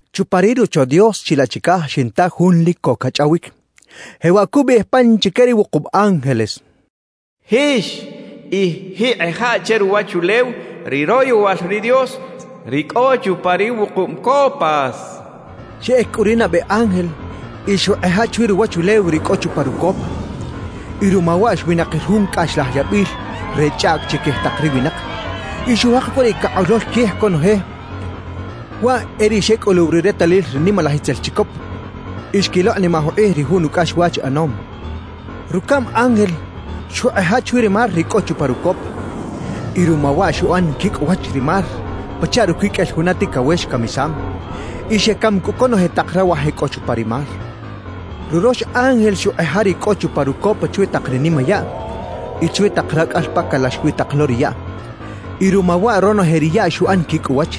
Chupa ri Rocho Dios chilaꞌ chicaj xinta jun lic co cachꞌawic, jewaꞌ cubiꞌij pan chique ri wukub ángeles: «Jix y jiꞌkꞌeja che ruwachulew ri royowal ri Dios, ri cꞌo chupa ri wukub copas» cachaꞌ. Xeꞌec cꞌu ri nabe ángel y xuꞌkꞌeja chwi ruwachulew ri cꞌo chupa rucopa, y ruma waꞌ xwinakir jun cꞌaxlaj yabil re chꞌaꞌc chiquij tak ri winak y xujek cꞌu riꞌ cakꞌolol quij conoje, waꞌ e ri xecꞌuluw ri retalil ri nimalaj itzel chicop y xquilokꞌnimaj ukꞌij ri jun ucꞌaxwach ꞌanom. Rucaꞌm ángel xuꞌkꞌeja chwi ri mar ri cꞌo chupa rucopa, y ruma waꞌ xuꞌan quicꞌ uwach ri mar pachaꞌ ruquiqꞌuel juna ticawex camisam; y xecam cꞌu conoje tak rawaj e cꞌo chupa ri mar. Rurox ángel xuꞌkꞌeja ri cꞌo chupa rucopa chwi tak ri nimayaꞌ y chwi tak racꞌal pa calax wi tak lo ri yaꞌ; y ruma waꞌ ronoje ri yaꞌ xuꞌan quicꞌ uwach.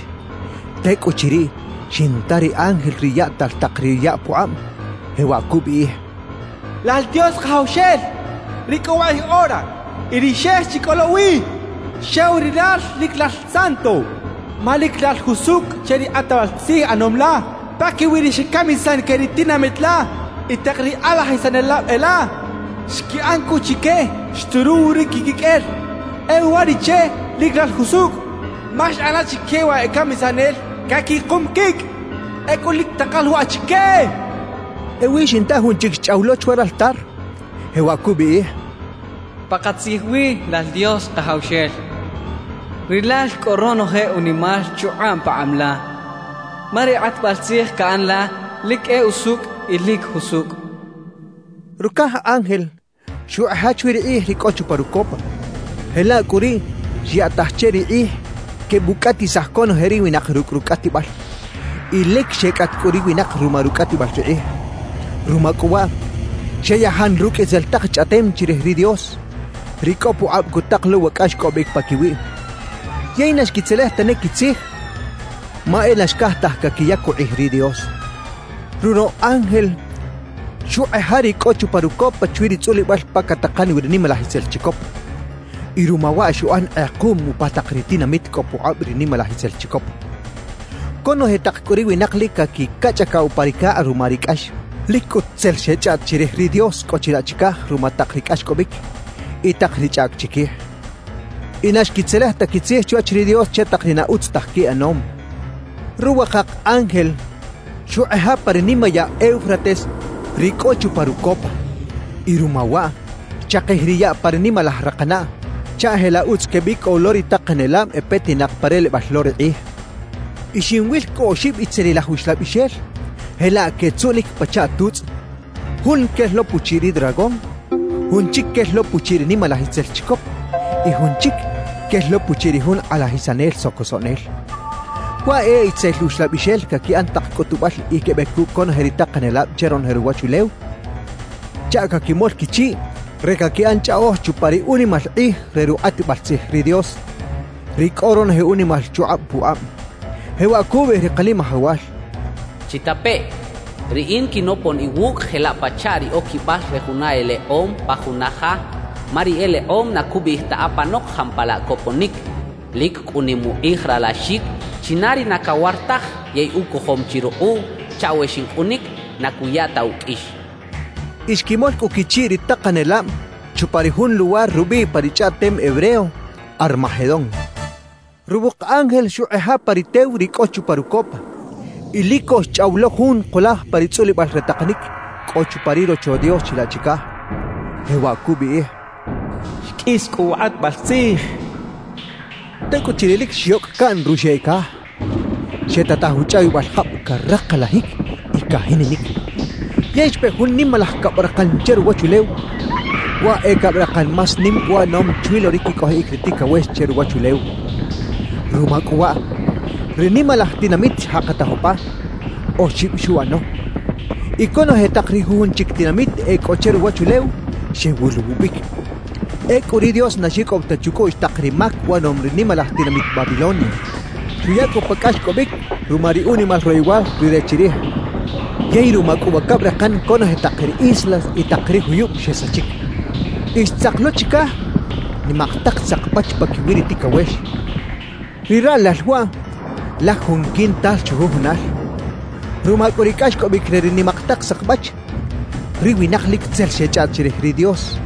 Tecꞌuchiriꞌ xinta ri ángel ri yaꞌtal tak ri yaꞌ pukꞌab, jewaꞌ cubiꞌij: «Lal Dios Kajawxel ri cꞌo wakꞌij ora y ri xex chi cꞌo lo wi, xew Rilal lic Lal Santo, ma lic Lal jusucꞌ che ri kꞌatbal tzij ꞌanom la paquiwi ri xecamisan que ri tinamit la y tak ri kꞌalajisanelab e la. Xquiꞌan cꞌu chique xturuw ri quiquiqꞌuel. E uwariꞌche lic Lal jusucꞌ ma xꞌan la chique wa e camisanel caquikum quicꞌ. ¡Ecꞌu lic takal waꞌ chique!» cachaꞌ. Ewi xinta jun chic xchꞌaw lo chwa raltar, jewaꞌ cubiꞌij: «Pakatzij wi, lal Dios Kajawxel, Rilal cꞌo ronoje unimal chukꞌab pakꞌab la, ma ri kꞌatbal tzij caꞌan la lic e usucꞌ y lic jusucꞌ» cachaꞌ. Rucaj ángel xuꞌkꞌeja chwi ri kꞌij ri cꞌo chupa rucopa, jelaꞌ cꞌu riꞌ xyaꞌtaj che ri kꞌij quebucꞌatisaj conoje ri winak rucꞌ rucꞌatibal. Y lic xecꞌat cꞌu ri winak ruma rucꞌatibal ri kꞌij. Ruma cꞌu waꞌ, xeyajan rucꞌ itzel tak chꞌaꞌtem chirij ri Dios, ri cꞌo pukꞌab cutak lo wa cꞌaxcꞌobic paquiwiꞌ. Yey na xquitzelej tane quitzij, ma e na xcaj taj caquiyac ukꞌij ri Dios. Ruroꞌ ángel xuꞌkꞌeja ri cꞌo chupa rucopa chwi ri tzꞌulibal pa catakan wi ri nimalaj itzel chicop, y ruma waꞌ xuꞌan kꞌekuꞌm upa tak ri tinamit cꞌo pukꞌab ri nimalaj itzel chicop. Conoje tak cꞌu ri winak lic caquicachꞌacaꞌ upa ri cakꞌ ruma ri cꞌax. Lic cꞌut tzel xechꞌaꞌt chirij ri Dios cꞌo chilaꞌ chicaj ruma tak ri cꞌaxcꞌobic y tak ri chꞌaꞌc chiquij; y na xquitzelej ta quitzij chwach ri Dios che tak ri na utz taj quiꞌanom. Ruwakak ángel xuꞌkꞌeja pa ri nimayaꞌ Eufrates ri cꞌo chupa rucopa; y ruma waꞌ, xchakij ri yaꞌ pa ri nimalaj rakanaꞌ, chaꞌ jelaꞌ utz quebicꞌow lo ri takanelab e petinak pa relebal lo ri kꞌij. Y xinwil cꞌu oxib itzelilaj uxlabixel jelaꞌ quetzuꞌnic pachaꞌ tutzꞌ; jun quel lo puchiꞌ ri dragón, jun chic quel lo puchiꞌ ri nimalaj itzel chicop y jun chic quel lo puchiꞌ ri jun kꞌalajisanel socosoꞌnel. Waꞌ e itzel uxlabixel caquiꞌan tak cꞌutubal y quebec cucꞌ conoje ri takanelab che ronoje ruwachulew chaꞌ caquimol quichiꞌ re caquiꞌan chꞌaꞌoj chupa ri unimal kꞌij re rukꞌatbal tzij ri Dios, ri cꞌo ronoje unimal chukꞌab pukꞌab. Jewaꞌ cubiꞌij ri Kanimajawal: «Chitapeꞌ, Riꞌin quinopon iwucꞌ jelaꞌ pachaꞌ ri oquibal re juna elekꞌom pa juna ja, ma ri elekꞌom na cubiꞌij ta apanok jampalaꞌ coponic. Lic cꞌu nim ukꞌij ralaxic china ri na cawar taj yey ucojom chi rukꞌuꞌ chaꞌ we xincꞌunic, na cuya ta uqꞌuix» xchaꞌ. Y xquimol cꞌu quichiꞌ ri takanelab chupa ri jun luwar rubiꞌ pa ri chꞌaꞌtem hebreo “Armagedón”. Ruwuk ángel xuꞌkꞌeja pa ri tew ri cꞌo chupa rucopa; y lic co xchꞌaw lo jun kulaj pa ri tzꞌulibal re takanic cꞌo chupa ri Rocho Dios chilaꞌ chicaj, jewaꞌ cubiꞌij: —Xqꞌuis cꞌu wa kꞌatbal tzij —cachaꞌ. Tecꞌuchiriꞌ lic xyocꞌ caꞌn ruxeꞌ caj, xetataj uchꞌawibal jab caraklajic y cajininic; yey xpe jun nimalaj cabrakan che ruwachulew, waꞌ e cabrakan más nim uꞌanom chwi lo ri quicꞌojiꞌic ri ticawex che ruwachulew. Ruma cꞌu waꞌ, ri nimalaj tinamit xjakataj upa, oxib xuꞌano; y conoje tak ri jujun chic tinamit e cꞌo che ruwachulew xewuluwubic. Ecꞌu ri Dios na xicꞌow ta chucꞌuꞌx tak ri mac uꞌanom ri nimalaj tinamit Babilonia; xuya cꞌu pa cꞌaxcꞌobic ruma ri unimal royowal Rire chirij. Yey ruma cꞌu wa cabrakan conoje tak ri islas y tak ri juyub xesachic. Y xtzak lo chicaj nimak tak sakbach paquiwi ri ticawex. Ri raꞌlal waꞌ laj jun quintal chujujunal. Ruma cꞌu ri cꞌaxcꞌobic re ri nimak tak sakbach, ri winak lic tzel xechꞌaꞌt chirij ri Dios,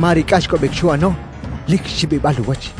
ma ri cꞌaxcꞌobic xuꞌano lic xibibal uwach.